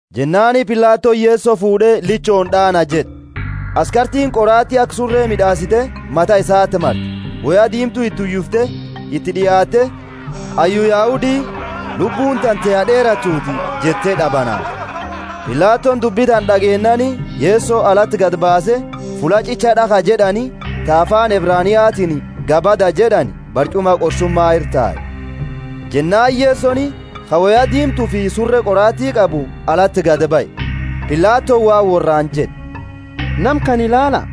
Jennaani Pilatoni Yeso fuud'e, Lichooni d'aana jed'e. Askartiini qoraati aka sure mid'aasite, mata isati marte; woya diimtu iti uyifte, iti d'iaatte, Hayyu Yahudi, Lubbuuni tante ha d'eeratuuti! jette d'abanaafte. Pilatoni dubbi tana d'ageennaani Yeso alati gadi baase fulla ch'icha d'akhaa jed'ani ta afaani Ebraniatiini Gabbatha jed'ani barch'uma qorsuma ira tae. Jennaani Yesoni, ka woya diimtufi sure qoraati qabu, alati gadi bahe. Pilatoni waan worraani jed'e, Nama kana ilaala!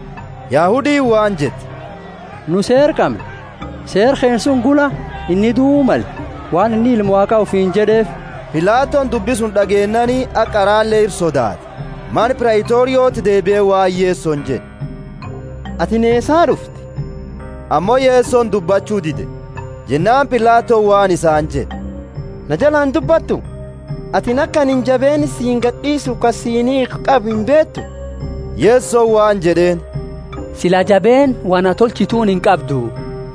Yahudiini waan jette, Nu seera qamna, seera keenna suni gula inni duu male, waan inni Ilma Waaqa ufiini jed'eefi. Pilatoni dubbi suni d'ageennaani haga qarale ira sodaate. Mana Praitorioti deebie waan Yesoni jed'e, Atini eesaa d'ufte? Ammo Yesoni dubbachu dide. Jennaani Pilatoni waan isaani jed'e, Na jalaa indubbattu atini aka anini jabeenna siini gad'iisufi ka siini hid'u qabu imbeetu? Yesoni waan jed'eeni, Sila jabeenna wo na tolchituuni inqabdu,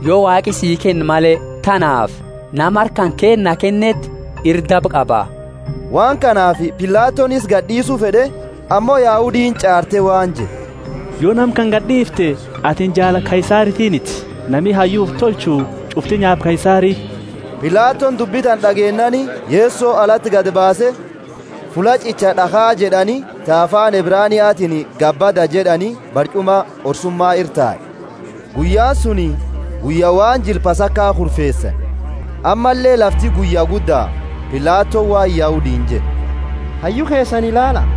yo Waaqi sii kenne male. Tanaafi nama harka kanketi na kenneeti ira daba qaba. Waan kanaafi Pilatoni isa gad'iisu fed'e, ammo Yahudiini ch'aarte waan jette, Yo nama kana gad'iifte atini jaala Kaisaritiiniti! Nami hayyu ufi tolchu ch'ufti nyaapa Kaisari. Pilatoni dubbi tana d'ageennaani Yeso alati gadi baase fulla ch'icha d'akhaa jed'ani ta afaani Ebraniatiini Gabbatha jed'ani barch'uma qorsuma ira tae. Guyyaani suni guyya waan jila Pasaka kureesani, ammalle lafti guyya gudda. Pilatoni waan Yahudiini jed'e, Hayyu keesani ilaala!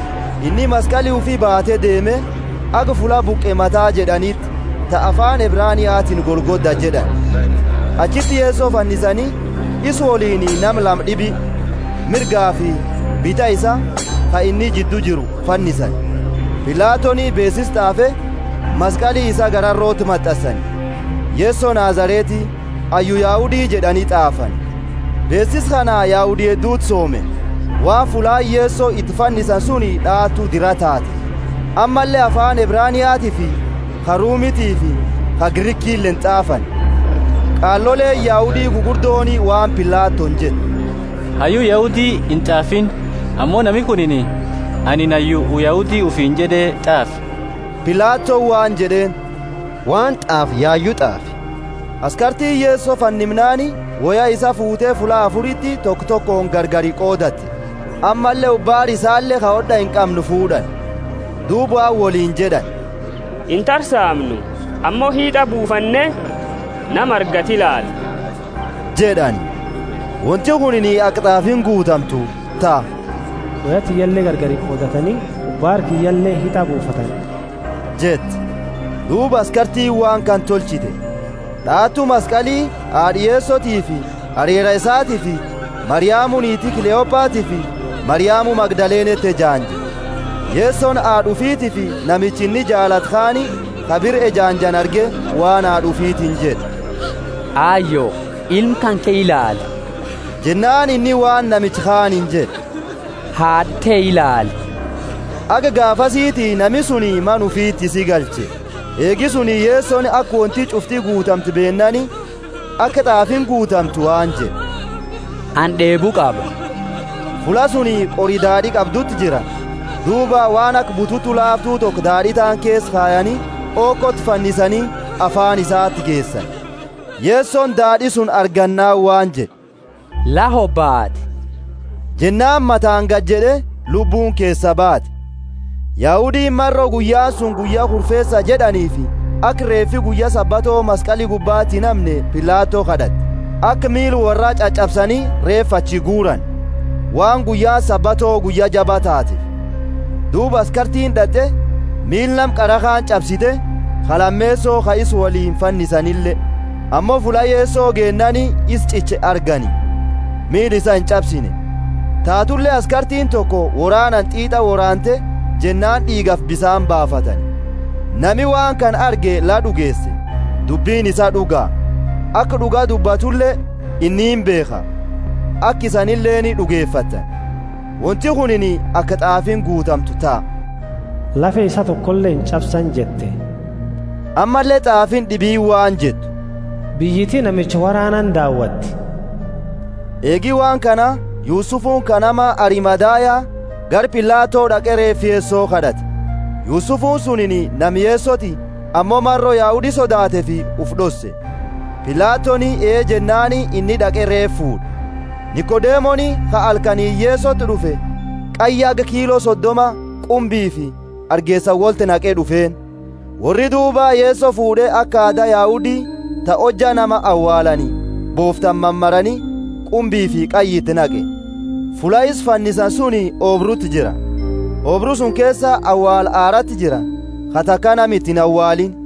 Inni maskali ufi baate deeme, haga fulla Buqe Mata jed'aniti, ta afaani Ebraniatiini Golgotha jed'ani. Achiti Yeso fannisani; isa woliini nama lama d'ibi, mirgafi bita isaa ka inni jiddu jiru fannisani. Pilatoni beesisa t'aafe, maskali isaa gararoti mat'ansani. Yeso Nazareti, hayyu Yahudi jed'ani t'aafani. Beesisa kana Yahudi hedduti soome, waan fullaani Yeso iti fannisani suni d'aatu dira tatefi. Ammalle afaani Ebraniatiifi ka Rumitiifi ka Grikileeni t'aafani. Qaaloleeni Yahudi gugurdooni waan Pilatoni jette, Hayyu Yahudi int'aafiini, ammo nami kunini, Anini hayyu Yahudi ufiini jed'e t'aafi. Pilatoni waan jed'eeni, Waan t'aafe yayu t'aafe. Askartiini Yeso fannimnaani woya isaa fuute fulla afuriti toko tokooni gargari qoodate, ammalle ubaara isaale ka hod'a inqamne fuud'ani. Duuba waan woliini jed'ani, Intarsaamnu ammo hit'a buufanne nama argatu ilaala jed'ani. Wonti kunini aka t'aafiini guutamtu ta, Woya tiyya gargari qoodatani, ubaara kiyyale hit'a buufatani, jette. Duuba askartiini waan kana tolchite. D'aatu maskali, haad'a Yesotiifi arera isatiifi Mariamu niiti Kleopatiifi Mariamu Magdaleneeti ejaanje. Yesoni haad'a ufitiifi namicha inni jaalatu kaani ka bira ejaanjani arge waan haad'a ufiitini jed'e, Ayo, ilma kanke ilaali. Jennaani inni waan namicha kaaniini jed'e, Haad'a te ilaali. Haga gaafasiti nami suni mana ufiti isi galche. Eegi suni Yesoni aka wonti ch'ufti guutamte beennaani, aka t'aafiini guutamtu waan jed'e, Anini d'eebu qaba. Fulla suni qori daad'i qabduti jira; duuba waan aka bututu laaftu toko daad'i taani keesa kayani, hokoti fannisani, afaani isaati geesani. Yesoni daad'i suni argannaani waan jed'e, La hobaate! Jennaani mataani gajed'e, lubbuuni keesaa baate. Yahudiini maro guyyaani suni guyya kurfeesa jed'aniifi aka reefi guyya Sabato maskali gubbaati inhamne, Pilato kad'ate, aka miila worraa ch'ach'absani reefa achi guurani. Waan guyyaani Sabato guyya jaba tatefi. Duuba askartiini d'at'e, miila nama qara kaani ch'absite, ka lameeso ka isa woliini fannisanile. Ammo fulla Yeso geennaani isa ch'iche argani, miila isa inch'absine. Taatule askartiini toko woraanani t'iit'a woraante jennaani d'iigafi bisaani baafatani. Nami waan kana arge la d'ugeese, dubbini isaa d'uga. Aka d'uga dubbatule inni imbeekha, aka isanileeni d'ugefattani. Wonti kunini aka t'aafiini guutamtu ta, Lafe isaa tokole inch'absani jette. Ammalle t'aafiini d'ibiini waan jettu, Biyyiti namicha woraanani daawatti. Eegi waan kana Yusufuni ka nama Arimathaya, gara Pilato d'aqe reefa Yeso kad'ate. (Yusufuni suniini nama Yesoti ammo maro Yahudi sodaateefi ufi d'osse.) Pilatoni ee jennaani inni d'aqe reefa fuud'e. Nikodemoni ka halkaniini Yesoti d'ufe qayya haga kiilo sodoma qumbiifi hargeesa wolti naqe d'ufeeni. Worri duuba Yeso fuud'e aka aada Yahudi ta hojja nama awaalani, booftani mamare qumbiifi qayya iti naqe. Fulla isa fannisani suni oobruti jira; oobru suni keesa awaala haraati jira, ka taka nama iti inawaaliini.